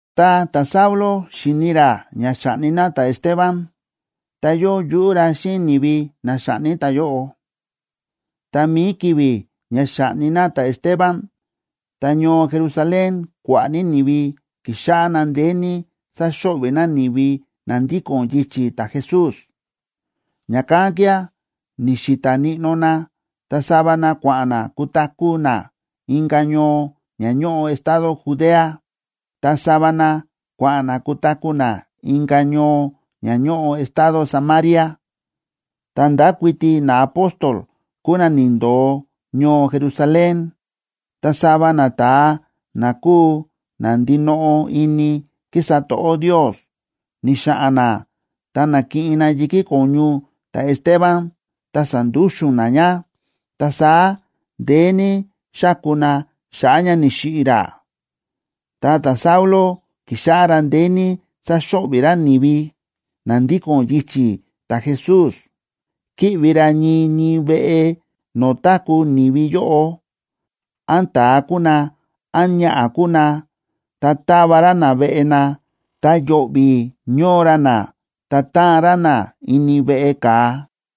Tá ta̱Saulo xi̱ni ra ña xa̱ꞌni na ta̱Esteban, ta yóo yuꞌú ra xíꞌin ni̱vi na xa̱ꞌni ta̱yóꞌo. Ta mi̱i ki̱vi̱ ña xa̱ꞌni na ta̱Esteban, ta ñoo Jerusalén kua̱ꞌa̱ ní ni̱vi ki̱xáꞌá na ndeé ní sáxo̱ꞌvi̱ na ni̱vi na ndíko̱n yichi̱ ta̱Jesús. Ña̱kán kía̱ ni̱xi̱ta̱ níꞌnó na, ta sava na kua̱ꞌa̱n na kutaku̱ na inka̱ ñoo ña ñóꞌo estado Judea, ta sava na kua̱ꞌa̱n na kutaku̱ na inka̱ ñoo ña ñóꞌo estado Samaria. Ta ndákuiti naapóstol kúu na ni̱ndo̱o ñoo Jerusalén. Ta sava nata̱a na kúu na ndinoꞌo ini kísa to̱ꞌó Ndios, ni̱xa̱ꞌa̱n na ta na̱kiꞌin na yi̱kí ko̱ñu ta̱Esteban ta sa̱ndúxu̱n na ña, ta saá ndeé ní xa̱ku na xa̱ꞌa̱ ña ni̱xiꞌi̱ ra. Ta ta̱Saulo ki̱xáꞌá ra ndeé ní sáxo̱ꞌvi̱ ra ni̱vi na ndíko̱n yichi̱ ta̱Jesús. Kíꞌvi ra ñii ñii veꞌe no̱o̱ táku̱ ni̱vi yóꞌo, án ta̱a kúu na, án ñaꞌa̱ kúu ná, ta táva ra na veꞌe na, ta yo̱ꞌvi̱ ñóo ra na, ta táan ra na ini veꞌe ka̱a.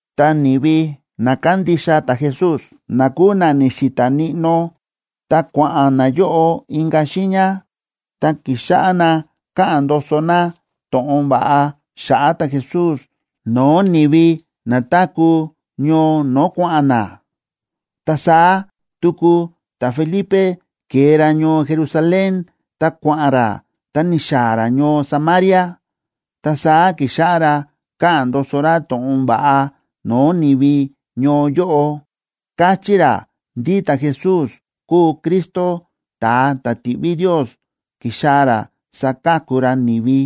Ta ni̱vi na kándixa ta̱Jesús na kúu na ni̱xi̱ta̱ níꞌnó, tá kua̱ꞌa̱n nayóꞌo inka̱ xiiña, ta ki̱xáꞌá na káꞌa̱n ndoso na to̱ꞌon va̱ꞌa xa̱ꞌa̱ ta̱Jesús no̱o̱ ni̱vi na táku̱ ñoo no̱o̱ kua̱ꞌa̱n na. Ta saá tuku ta̱Felipe ke̱e ra ñoo Jerusalén ta kua̱ꞌa̱n ra ta ni̱xaa̱ ra ñoo Samaria. Ta saá ki̱xáꞌá ra káꞌa̱n ndoso ra to̱ꞌon va̱ꞌa no̱o̱ ni̱vi ñoo yóꞌo, káchí ra ndí ta̱Jesús kúu Cristo ta̱a ta̱ ti̱ꞌví Ndios ki̱xaa̱ ra saka̱ku ra ni̱vi.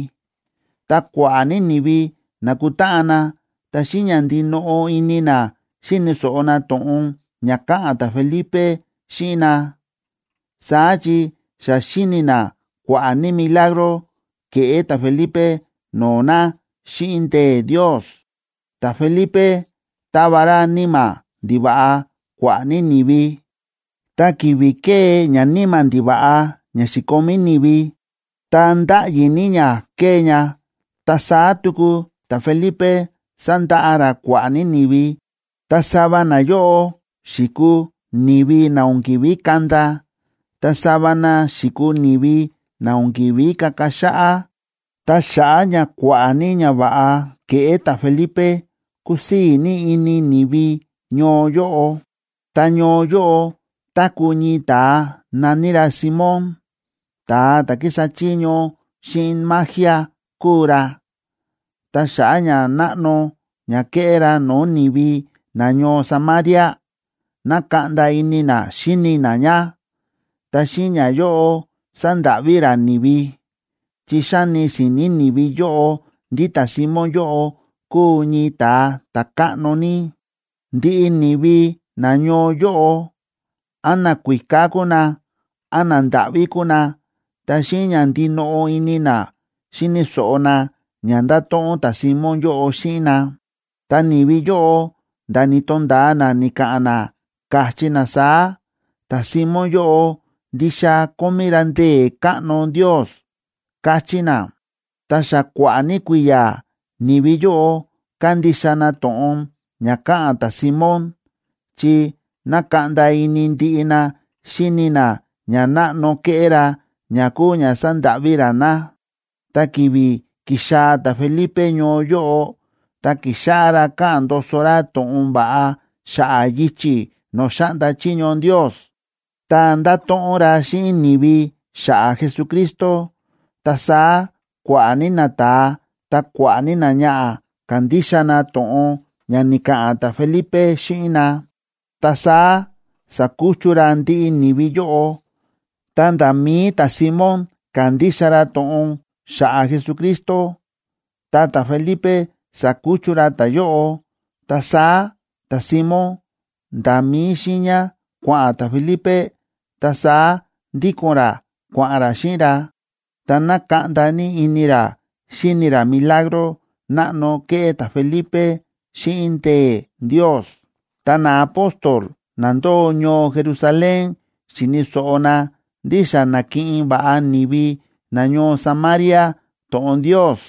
Ta kua̱ꞌa̱ ní ni̱vi na̱kutáꞌan na, ta xíꞌin ña ndinoꞌo ini na xíni̱ so̱ꞌo na to̱ꞌon ña káꞌa̱n ta̱Felipe xíꞌin na, saá chi xa xi̱ni na kua̱ꞌa̱ ní milagro ke̱ꞌé ta̱Felipe no̱o̱ na xíꞌin ndee̱ Ndios. Ta̱Felipe táva ra níma̱ ndiva̱ꞌa kua̱ꞌa̱ ní ni̱vi, ta ki̱vi̱ kée ñaníma̱ ndiva̱ꞌa ña xi̱komí ni̱vi, ta ndáꞌyi ní ña kée ña. Ta saá tuku ta̱Felipe sa̱ndaꞌa ra kua̱ꞌa̱ ní ni̱vi, ta sava nayóꞌo xi̱kuu ni̱vi na o̱n ki̱ví kanda, ta sava na xi̱kuu ni̱vi na o̱n ki̱ví kaka xáꞌá. Ta xa̱ꞌa̱ ña kua̱ꞌa̱ ní ñava̱ꞌa kéꞌé ta̱Felipe, kúsii̱ ní ini ni̱vi ñoo yóꞌo. Ta ñoo yóꞌo táku̱ ñii ta̱a na̱ní ra Simón, ta̱a ta̱ kísa chiño xíꞌin magia kúu ra, ta xa̱ꞌa̱ ñanáꞌno ña ke̱ꞌé ra no̱o̱ ni̱vi nañoo Samaria, na̱kaꞌnda ini na xíni na ña. Ta xíꞌin ñayóꞌo sa̱ndáꞌví ra ni̱vi, chi xáni si̱ni̱ ni̱vi yóꞌo ndí ta̱Simón yóꞌo kúu ñii ta̱a ta̱káꞌno ní. Ndiꞌi ni̱vi nañoo yóꞌo, án nakuíká kúu na, án nandáꞌví kúu na, ta xíꞌin ña ndinoꞌo ini na xíni̱ so̱ꞌo na ña nda̱to̱ꞌon ta̱Simón yóꞌo xíꞌin na. Ta ni̱vi yóꞌo nda̱ ni̱to̱nda̱a na ni̱ka̱ꞌa̱n na, káchí na saá: ―Ta̱Simón yóꞌo ndixa kómí ra ndee̱ káꞌno Ndios ―káchí na. Ta xa kua̱ꞌa̱ ní kui̱ya̱ ni̱vi yóꞌo kándixa na to̱ꞌon ña káꞌa̱n ta̱Simón chi nákaꞌnda ini ndiꞌi na xíni na ñanáꞌno ke̱ꞌé ra ña kúu ña sándáꞌví ra na. Ta ki̱vi̱ ki̱xaa̱ ta̱Felipe ñoo yóꞌo, ta ki̱xáꞌá ra káꞌa̱n ndoso ra to̱ꞌon va̱ꞌa xa̱ꞌa̱ yichi̱ no̱o̱ xáꞌnda chiño Ndios, ta nda̱to̱ꞌon ra xíꞌin ni̱vi xa̱ꞌa̱ Jesucristo. Ta saá kua̱ꞌa̱ ní nata̱a, ta kua̱ꞌa̱ ní náñaꞌa̱, ka̱ndixa na to̱ꞌon ña ni̱ka̱ꞌa̱n ta̱Felipe xíꞌin na, ta saá sa̱kuchu ra ndiꞌi ni̱vi yóꞌo. Ta nda̱ mi̱i ta̱Simón ka̱ndixa ra to̱ꞌon xa̱ꞌa̱ Jesucristo, ta ta̱Felipe sa̱kuchu ra ta̱yóꞌo. Ta saá ta̱Simón nda̱ mí xiiña kua̱ꞌa̱n ta̱Felipe, ta saá ndíko̱n ra kua̱ꞌa̱n ra xíꞌin ra, ta nákaꞌnda ní ini ra xíni ra milagro náꞌno kéꞌé ta̱Felipe xíꞌin ndee̱ Ndios. Tá naapóstol na ndóo ñoo Jerusalén xi̱ni̱ so̱ꞌo na ndí xa na̱kiꞌin va̱ꞌa ni̱vi nañoo Samaria to̱ꞌon Ndios,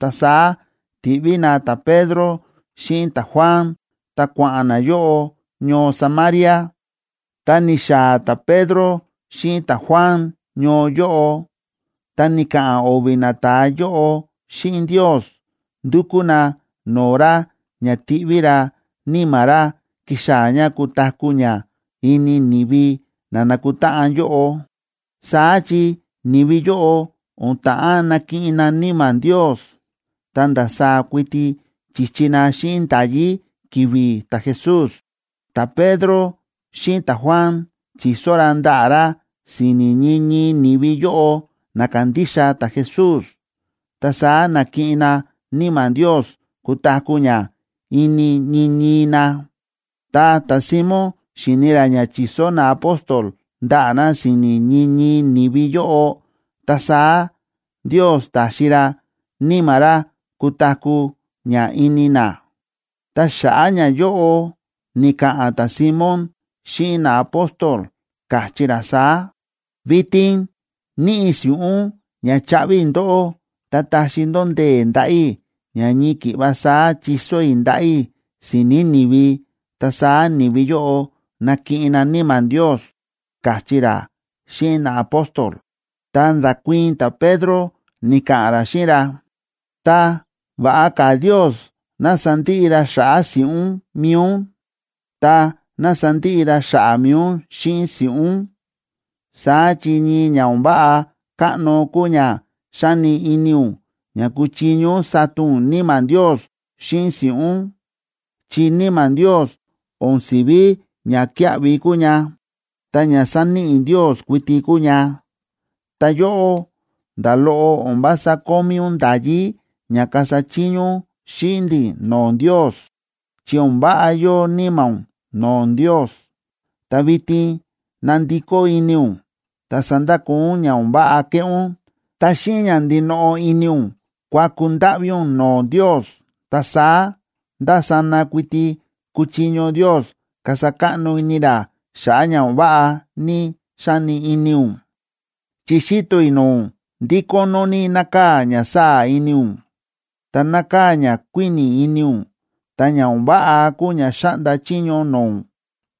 ta saá ti̱ꞌví na ta̱Pedro xíꞌin ta̱Juan, ta kua̱ꞌa̱n nayóꞌo ñoo Samaria. Tá ni̱xaa̱ ta̱Pedro xíꞌin ta̱Juan ñoo yóꞌo, ta ni̱ka̱ꞌa̱n o̱vi̱ nata̱a yóꞌo xíꞌin Ndios, ndu̱kú na no̱o̱ ra ña tiꞌví ra Níma̱ ra kixaa̱ ña kutaku̱ ña ini ni̱vi na nákutáꞌan yóꞌo. Saá chi ni̱vi yóꞌo o̱n ta̱ꞌán nakiꞌin na Níma̱ Ndios, ta ndasaá kuiti chi̱chi na xíꞌin nda̱yí ki̱vi̱ ta̱Jesús. Ta̱Pedro xíꞌin ta̱Juan chi̱so ra ndaꞌa̱ ra si̱ni̱ ñii ñii ni̱vi yóꞌo na ka̱ndixa ta̱Jesús, ta saá na̱kiꞌin na Níma̱ Ndios kutaku̱ ña ini ñii ñii na. Ta ta̱Simón xi̱ni ra ña chi̱so naapóstol ndaꞌa̱ na si̱ni̱ ñii ñii ni̱vi yóꞌo, ta saá Ndios ta̱xi ra Níma̱ ra kutaku̱ ña ini na. Ta xa̱ꞌa̱ ñayóꞌo, ni̱ka̱ꞌa̱n ta̱Simón xíꞌin naapóstol, káchí ra saá: ―Vitin níꞌi i̱ si̱ꞌún ña chaꞌvi i̱ ndóꞌó, tá taxi ndó ndee̱ ndaꞌa̱ i̱ ña ñii ki̱ꞌva saá chiso i̱ ndaꞌa̱ i̱ si̱ni̱ ni̱vi ta saá ni̱vi yóꞌo nakiꞌin na Níma̱ Ndios ―káchí ra xíꞌin naapóstol. Ta nda̱kuii̱n ta̱Pedro ni̱ka̱ꞌa̱n ra xíꞌin ra: ―Ta, ¡va̱ꞌa ka̱ Ndios ná sandiꞌi ra xa̱ꞌa̱ si̱ꞌún mi̱i ún! Ta, ¡ná sandiꞌi ra xa̱ꞌa̱ mi̱i ún xíꞌin si̱ꞌún! Saá chi ñii ña o̱n váꞌa káꞌno kúu ña xáni ini ún ña kúchiño ún sata ún Níma̱ Ndios xíꞌin si̱ꞌún, chi Níma̱ Ndios o̱n si̱ví ñakíaꞌvi kúu ña, ta ña sáníꞌi Ndios kuiti kúu ña. Ta yóꞌó, nda̱ loꞌo o̱n vása kómí ún nda̱yí ña kasa chiño ún xíꞌin ndi̱ no̱o̱ Ndios, chi o̱n váꞌa yóo níma̱ ún no̱o̱ Ndios. Ta vitin ná ndikó ini ún, ta sandakoo ún ña o̱n váꞌa kéꞌé ún, ta xíꞌin ña ndinoꞌo ini ún kuaku ndáꞌví ún no̱o̱ Ndios, ta saá ndásana kuiti kuchiño Ndios kasa káꞌno ini ra xa̱ꞌa̱ ña o̱n váꞌa ní xa̱ni ini ún. Chi xíto i̱ no̱o̱ ún ndí kónó ní nákaa̱ ña sáa̱ ini ún, ta nákaa̱ ñakuíni̱ ini ún, ta ña o̱n váꞌa kúu ña xáꞌnda chiño no̱o̱ ún,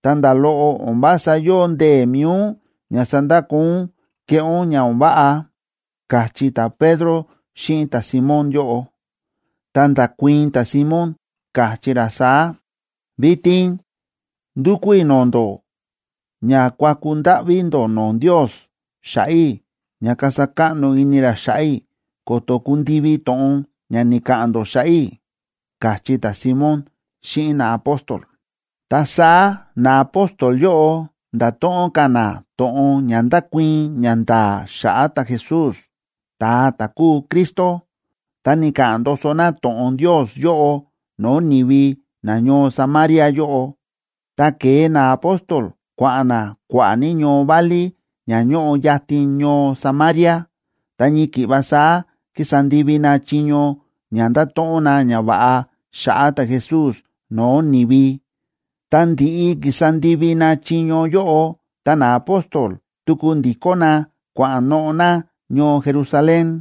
ta nda̱ loꞌo o̱n vása yóo ndee̱ mi̱i ún ña sandakoo ún kéꞌé ún ña o̱n váꞌa ―káchí ta̱Pedro xíꞌin ta̱Simón yóꞌo. Ta nda̱kuii̱n ta̱Simón, káchí ra saá: ―Vitin ndúkú i̱ no̱o̱ ndó ña kuaku ndáꞌví ndó no̱o̱ Ndios xa̱ꞌa̱ i̱ ña kasa káꞌno ini ra xa̱ꞌa̱ i̱ ko̱to̱ kundivi to̱ꞌon ña ni̱ka̱ꞌa̱n ndó xa̱ꞌa̱ i̱ ―káchí ta̱Simón xíꞌin naapóstol. Ta saá naapóstol yóꞌo nda̱to̱ꞌon ka̱ na to̱ꞌon ña ndákuii̱n ñanda̱a̱ xa̱ꞌa̱ ta̱Jesús, ta̱a ta̱ kúu Cristo, ta ni̱ka̱ꞌa̱n ndoso na to̱ꞌon Ndios yóꞌo no̱o̱ ni̱vi nañoo Samaria yóꞌo. Ta ke̱e naapóstol kua̱ꞌa̱n na kua̱ꞌa̱ ní ñoo válí ña ñóꞌo yatin ñoo Samaria, ta ñii ki̱ꞌva saá ki̱sa ndivi na chiño ña ndáto̱ꞌon na ñava̱ꞌa xa̱ꞌa̱ ta̱Jesús no̱o̱ ni̱vi. Ta ndi̱ꞌi ki̱sa ndivi na chiño yóꞌo, ta naapóstol tuku ndi̱kó na kua̱ꞌa̱n noꞌo̱ na ñoo Jerusalén.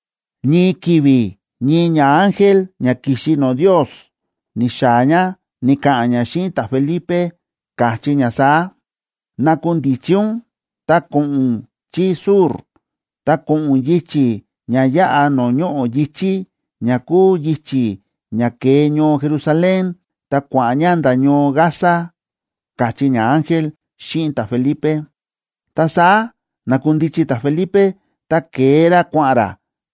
Ñii ki̱vi̱ ñii ñaángel ña ki̱xi no̱o̱ Ndios ni̱xaa̱ ña, ni̱ka̱ꞌa̱n ña xíꞌin ta̱Felipe, káchí ña saá: ―Nakundichi ún, ta ko̱ꞌo̱n ún chí sur, ta ko̱ꞌo̱n ún yichi̱ ña yáꞌa no̱o̱ ñoꞌo̱ yi̱chí, ña kúu yichi̱ ña kée ñoo Jerusalén ta kua̱ꞌa̱n ña nda̱ ñoo Gaza ―káchí ñaángel xíꞌin ta̱Felipe. Ta saá na̱kundichi ta̱Felipe, ta ke̱e ra kua̱ꞌa̱n ra.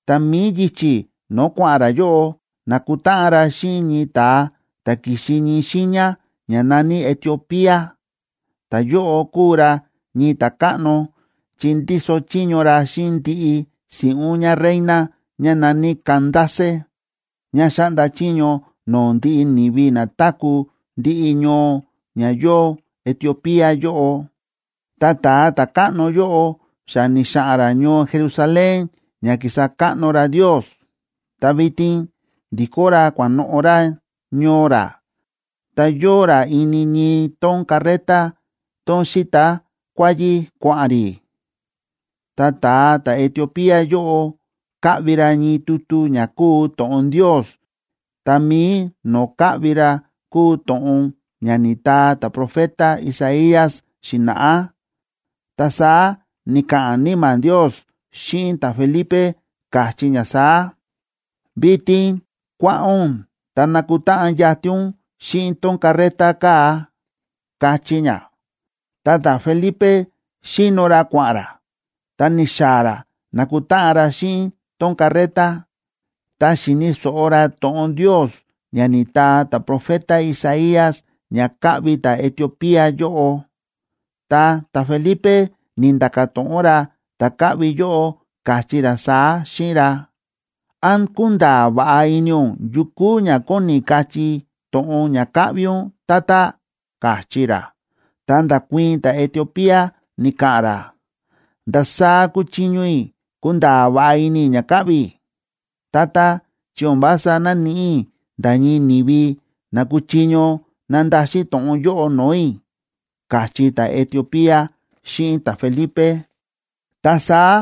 Ta mi̱i yichi̱ no̱o̱ kua̱ꞌa̱n ra yóꞌo, na̱kutáꞌan ra xíꞌin ñii ta̱a ta̱ ki̱xi ñii xiiña ña na̱ní Etiopía. Ta̱yóꞌo kúu ra ñii ta̱káꞌno, chi ndíso chiño ra xíꞌin ndiꞌi si̱ꞌún ñáreina ñá na̱ní Candace, ñá xáꞌnda chiño no̱o̱ ndiꞌi ni̱vi na táku̱ ndiꞌi ñoo ña yóo Etiopía yóꞌo. Ta ta̱a ta̱káꞌno yóꞌo xa ni̱xa̱ꞌa̱n ra ñoo Jerusalén ña ki̱sa káꞌno ra Ndios, ta vitin ndi̱kó ra kua̱ꞌa̱n noꞌo̱ ra ñoo ra. Ta yóo ra ini ñii tón carreta, tón síta kuáyí kua̱ꞌa̱n rí. Ta ta̱a ta̱Etiopía yóꞌo káꞌvi ra ñii tutu ña kúu to̱ꞌon Ndios, ta mi̱i no̱o̱ káꞌvi ra kúu to̱ꞌon ña ni̱taa ta̱profeta Isaías xi̱na̱ꞌá. Ta saá ni̱ka̱ꞌa̱n Níma̱ Ndios xíꞌin ta̱Felipe, káchí ña saá: ―Vitin kua̱ꞌa̱n ún, ta ná kutáꞌan yatin ún xíꞌin tón carreta kaa̱ ―káchí ña. Ta ta̱Felipe xíno ra kua̱ꞌa̱n ra, ta ni̱xaa̱ ra na̱kutáꞌan ra xíꞌin tón carreta, ta xi̱ni̱ so̱ꞌo ra to̱ꞌon Ndios ña ni̱taa ta̱profeta Isaías ña káꞌvi ta̱Etiopía yóꞌo. Ta ta̱Felipe ni̱nda̱ka̱ to̱ꞌon ra ta̱ káꞌvi yóꞌo, káchí ra saá xíꞌin ra: ―¿Án kúnda̱a̱ va̱ꞌa ini ún yu kúu ña kóni kachí to̱ꞌon ña káꞌvi ún, tata? ―káchí ra. Ta nda̱kuii̱n ta̱Etiopía, ni̱ka̱ꞌa̱n ra: ―¿Ndasaá kuchiño i̱ kunda̱a̱ va̱ꞌa ini i̱ ña káꞌvi i̱?, tata, chi o̱n vása náníꞌi i̱ nda̱ ñii ni̱vi na kúchiño nandaxin to̱ꞌon yóꞌo no̱o̱ i̱ ―káchí ta̱Etiopía xíꞌin ta̱Felipe. Ta saá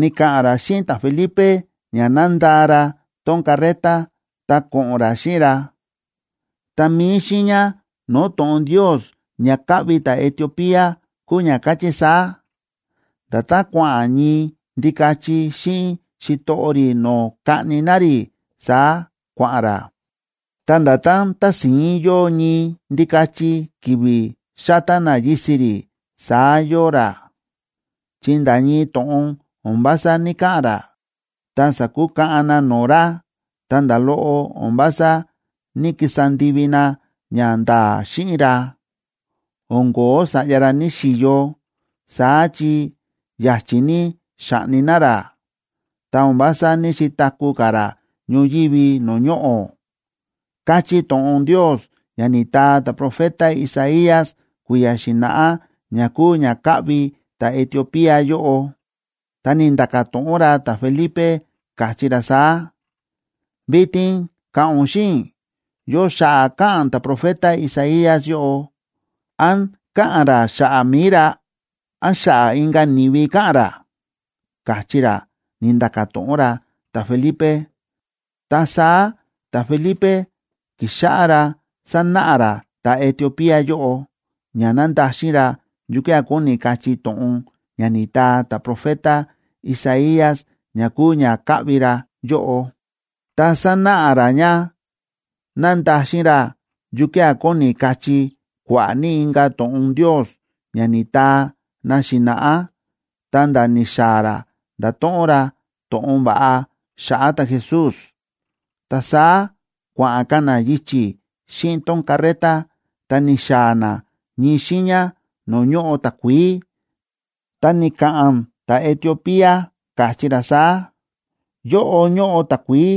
ni̱ka̱ꞌa̱n ra xíꞌin ta̱Felipe ña ná ndaa ra tón carreta, ta ko̱ꞌo̱n ra xíꞌin ra. Ta mi̱i xiiña no̱o̱ to̱ꞌon Ndios ña káꞌvi ta̱Etiopía kúu ña káchí saá: Nda̱tán kua̱ꞌa̱n ñii ndikachi xíꞌin xitoꞌo rí no̱o̱ kaꞌni na rí, saá kua̱ꞌa̱n ra. Ta nda̱tán tási̱ín yóo ñii ndikachi ki̱vi̱ xátá na yisi̱ rí, saá yóo ra, chi nda̱ ñii to̱ꞌon o̱n vása ní‑kaꞌa̱n ra. Ta sa̱kukaꞌan na no̱o̱ ra, ta nda̱ loꞌo o̱n vása ní‑kisa ndivi na ñanda̱a̱ xíꞌin ra. O̱n ko̱ó sa̱ꞌya ra ní‑xiyo, saá chi ya̱chi̱ ní xa̱ꞌni na ra ta o̱n vása ní‑xitaku̱ ka̱ ra ñoyívi no̱o̱ ñoꞌo̱, káchí to̱ꞌon Ndios ña ni̱taa ta̱profeta Isaías kui̱ya̱ xi̱na̱ꞌá, ña kúu ña káꞌvi ta̱Etiopía yóꞌo. Ta ni̱nda̱ka̱ to̱ꞌon ra ta̱Felipe, káchí ra saá: ―Vitin ka̱ꞌa̱n ún xíꞌin i̱, ¿yo xa̱ꞌa̱ káꞌa̱n ta̱profeta Isaías yóꞌo?, ¿án káꞌa̱n ra xa̱ꞌa̱ mi̱i ra?, ¿án xa̱ꞌa̱ inka̱ ni̱vi káꞌa̱n ra? ―káchí ra, ni̱nda̱ka̱ to̱ꞌon ra ta̱Felipe. Ta saá ta̱Felipe ki̱xáꞌá ra sánáꞌa ra ta̱Etiopía yóꞌo, ña nandaxin ra yukía̱ kóni kachí to̱ꞌon ña ni̱taa ta̱profeta Isaías ña kúu ña káꞌvi ra yóꞌo, ta sánáꞌa ra ña nandaxin ra yukía̱ kóni kachí kua̱ꞌa̱ ní inka̱ to̱ꞌon Ndios ña ni̱taa na xi̱na̱ꞌá, ta̱nda̱ ni̱xaa̱ ra ndáto̱ꞌon ra to̱ꞌon va̱ꞌa xa̱ꞌa̱ ta̱Jesús. Ta saá kua̱ꞌa̱n ka̱ na yichi̱ xíꞌin tón carreta, ta ni̱xaa̱ na ñii xiiña no̱o̱ ñóꞌo takuií. Ta ni̱ka̱ꞌa̱n ta̱Etiopía, káchí ra saá: ―Yóꞌo ñóꞌo takuií.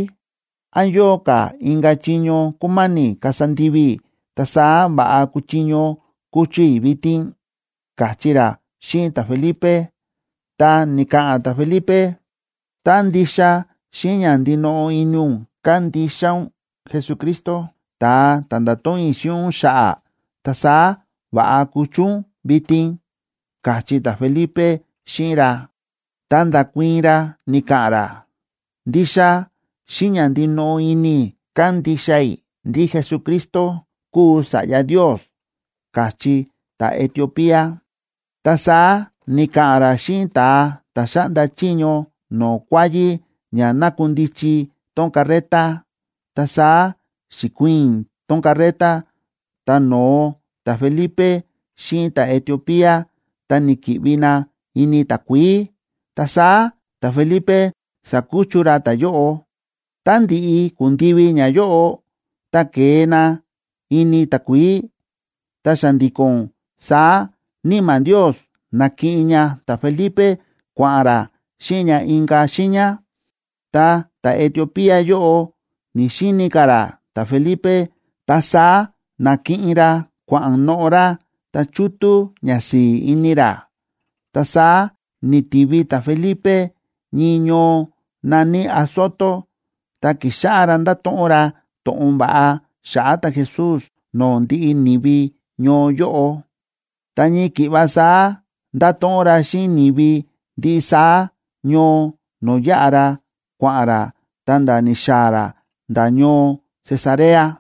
¿Án yóo ka̱ inka̱ chiño kúma̱ni̱ kasa ndivi i̱, ta saá va̱ꞌa kuchiño kuchu i̱ vitin? ―káchí ra xíꞌin ta̱Felipe. Ta ni̱ka̱ꞌa̱n ta̱Felipe: ―Tá ndixa xíꞌin ña ndinoꞌo ini ún kándixa ún Jesucristo, ta̱a ta̱ nda̱to̱ꞌon i̱ xíꞌin ún xa̱ꞌa̱, ta saá va̱ꞌa kuchu ún vitin ―káchí ta̱Felipe xíꞌin ra. Ta nda̱kuii̱n ra ni̱ka̱ꞌa̱n ra: ―Ndixa xíꞌin ña ndinoꞌo ini i̱ kándixa i̱ ndí Jesucristo kúu Sa̱ꞌya Ndios ―káchí ta̱Etiopía. Ta saá ni̱ka̱ꞌa̱n ra xíꞌin ta̱a ta̱ xáꞌnda chiño no̱o̱ kuáyí ña nakundichi tón carreta. Ta saá xi̱kuiin tón carreta, ta no̱o ta̱Felipe xíꞌin ta̱Etiopía, ta ni̱ki̱ꞌvi na ini takuií. Ta saá ta̱Felipe sa̱kuchu ra ta̱yóꞌo. Tá ndi̱ꞌi ku̱ndivi ñayóꞌo, ta ke̱e na ini takuií, ta xa̱ndi̱ko̱n saá Níma̱ Ndios na̱kiꞌin ña ta̱Felipe kua̱ꞌa̱n ra xíꞌin ña inka̱ xiiña. Ta ta̱Etiopía yóꞌo ni̱‑xini ka̱ ra ta̱Felipe, ta saá na̱kiꞌin ra kua̱ꞌa̱n noꞌo̱ ra, ta chútú ñasi̱i̱ ini ra. Ta saá ni̱tivi ta̱Felipe ñii ñoo na̱ní Azoto. Ta ki̱xáꞌá ra ndáto̱ꞌon ra to̱ꞌon va̱ꞌa xa̱ꞌa̱ ta̱Jesús no̱o̱ ndiꞌi ni̱vi ñoo yóꞌo, ta ñii ki̱ꞌva saá nda̱to̱ꞌon ra xíꞌin ni̱vi ndiꞌi saá ñoo no̱o̱ yáꞌa ra, kua̱ꞌa̱n ra, ta̱nda̱ ni̱xaa̱ ra nda̱ ñoo Cesarea.